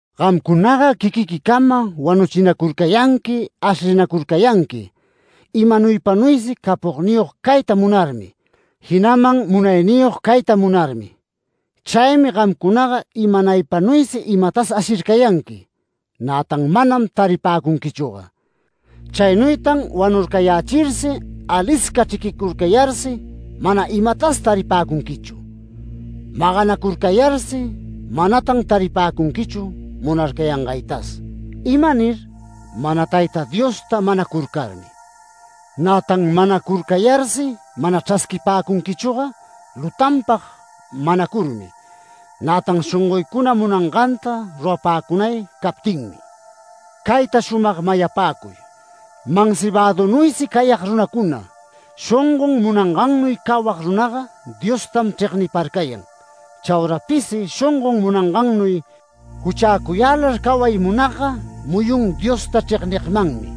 Gamcunaga quiquiquicama wanuchinacurcayanqui, ashlinacurcayanqui, imanuypanuysi capogniyog cayta munarmi, jinaman munayniyog cayta munarmi. Chaymi gamcunaga imanaypanuysi imatas ashircayanqui, nätan manam taripäcunquichüga. Chaynuytan wanurcayächirsi, alisca chriquicurcayarsi mana imatas taripäcunquichu. Maganacurcayarsi manatan taripäcunquichu munarcayangaytas. ¿Imanir? Mana Tayta Diosta manacurcarmi. Nätan manacurcayarsi mana chrasquipäcunquichüga, lutanpag manacurmi, nätan shongoycuna munanganta rurapäcunay captinmi. Cayta shumag mayapäcuy: Mansibadunuysi cayag runacuna, shongon munangannuy cawag runaga Diostam chregniparcayan. Chaura pisi shongon munangannuy juchäcuyälar caway munagga muyun Diosta chregnigmanmi.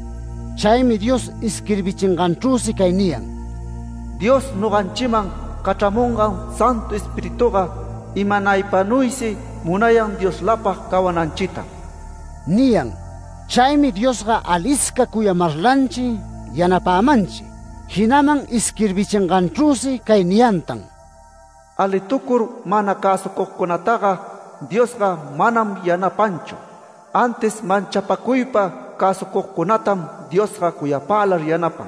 Chaymi Dios isquirbichinganchrüsi cay niyan: “Dios noganchiman cachramungan Santu Espirituga imanaypanuysi munayan Dioslapag cawananchitam” niyan. Chaymi Diosga alisca cuyamarlanchi yanapämanchi, jinaman isquirbichinganchrüsi cay niyantan: “Alitucur mana cäsucugcunataga Diosga manam yanapanchu. Antis manchapacuypa cäsucugcunatam Diosga cuyapälar yanapan”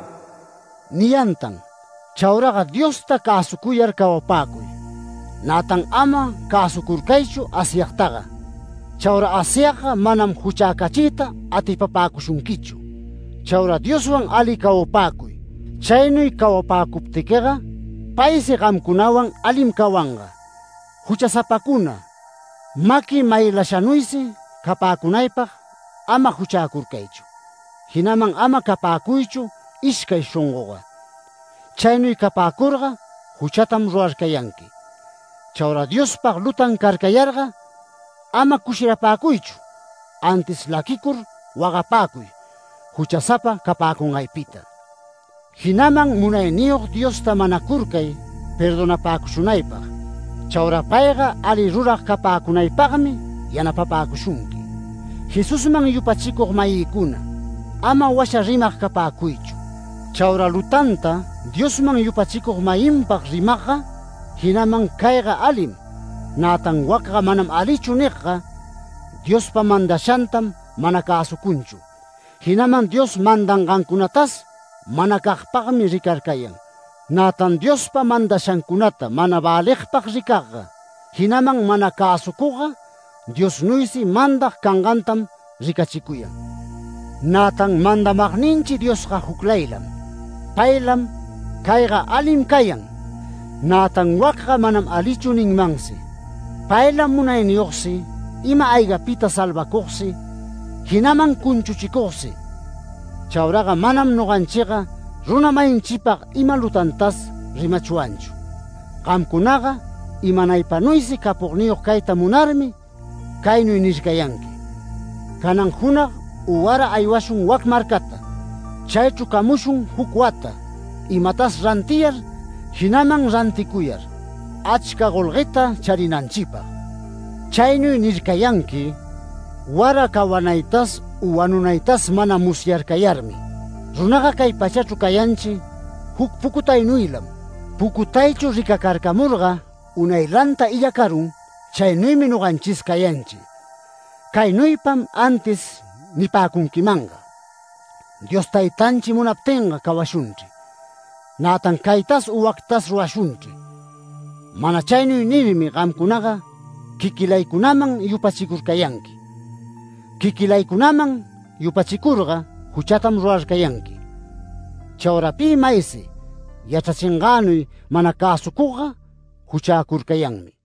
niyantan. Chauraga Diosta cäsucuyar cawapäcuy. Nätan ama cäsucurcaychu Asyagtaga. Chaura Asyagga manam juchäcachiyta atipapäcushunquichu. Chaura Dioswan ali cawapäcuy. Chaynuy cawapäcuptiquiga paysi gamcunawan alim cawanga. Juchasapacuna, maqui maylashanuysi capäcunaypag ama juchäcurcaychu, jinaman ama capäcuychu ishcay shongoga. Chaynuy capäcurga juchatam rurarcayanqui. Chaura Diospag lutan carcayarga ama cushirapäcuychu, antis laquicur wagapäcuy, juchasapa capäcungaypita. Jinaman Munayniyog Diosta manacurcay perdonapäcushunaypag. Chaura payga ali rurag capäcunaypagmi yanapapäcushunqui. Jesusman yupachicug-mayïcuna, ama washa rimag capäcuychu. Chaura lutanta Diosman yupachicug-mayinpag rimagga, jinaman “Cayga alim”, nätan “Wacga manam alichu” nigga, Diospa mandashantam mana cäsucunchu, jinaman Dios mandangancunatas manacagpagmi ricarcayan. Nätan Diospa mandashancunata mana väligpag ricagga, jinaman mana cäsucugga, Diosnuysi mandag cangantam ricachicuyan. Nätan mandamagninchi Diosga juclaylam. Paylam “Cayga alim cayan”, nätan “Wacga manam alichu” ninmansi. Paylam munayniyogsi, ima-aygapita salvacugsi, jinaman cunchuchicugsi. Chauraga manam noganchiga runa-mayinchipag ima lutantas rimachwanchu. Gamcunaga imanaypanuysi capogniyog cayta munarmi caynuy nircayanqui: “Canan junag u wara aywashun wac marcata. Chaychru camushun juc wata, imatas rantiyar, jinaman ranticuyar, achca golgueta charinanchipag”. Chaynuy nircayanqui wara cawanaytas u wanunaytas mana musyarcayarmi. Runaga cay pachachru cayanchi juc pucutaynuylam. Pucutaychu ricacarcamurga unaylanta illacarun, chaynuymi noganchis cayanchi. Caynuypam antis nipäcunquimanga: “Dios Taytanchi munaptinga cawashunchri. Nätan caytas u wactas rurashunchri”. Mana chaynuy nirmi gamcunaga quiquilaycunaman yupachicurcayanqui. Quiquilaycunaman yupachicurga juchatam rurarcayanqui. Chaura pi maysi yachrachingänuy mana cäsucugga juchäcurcayanmi.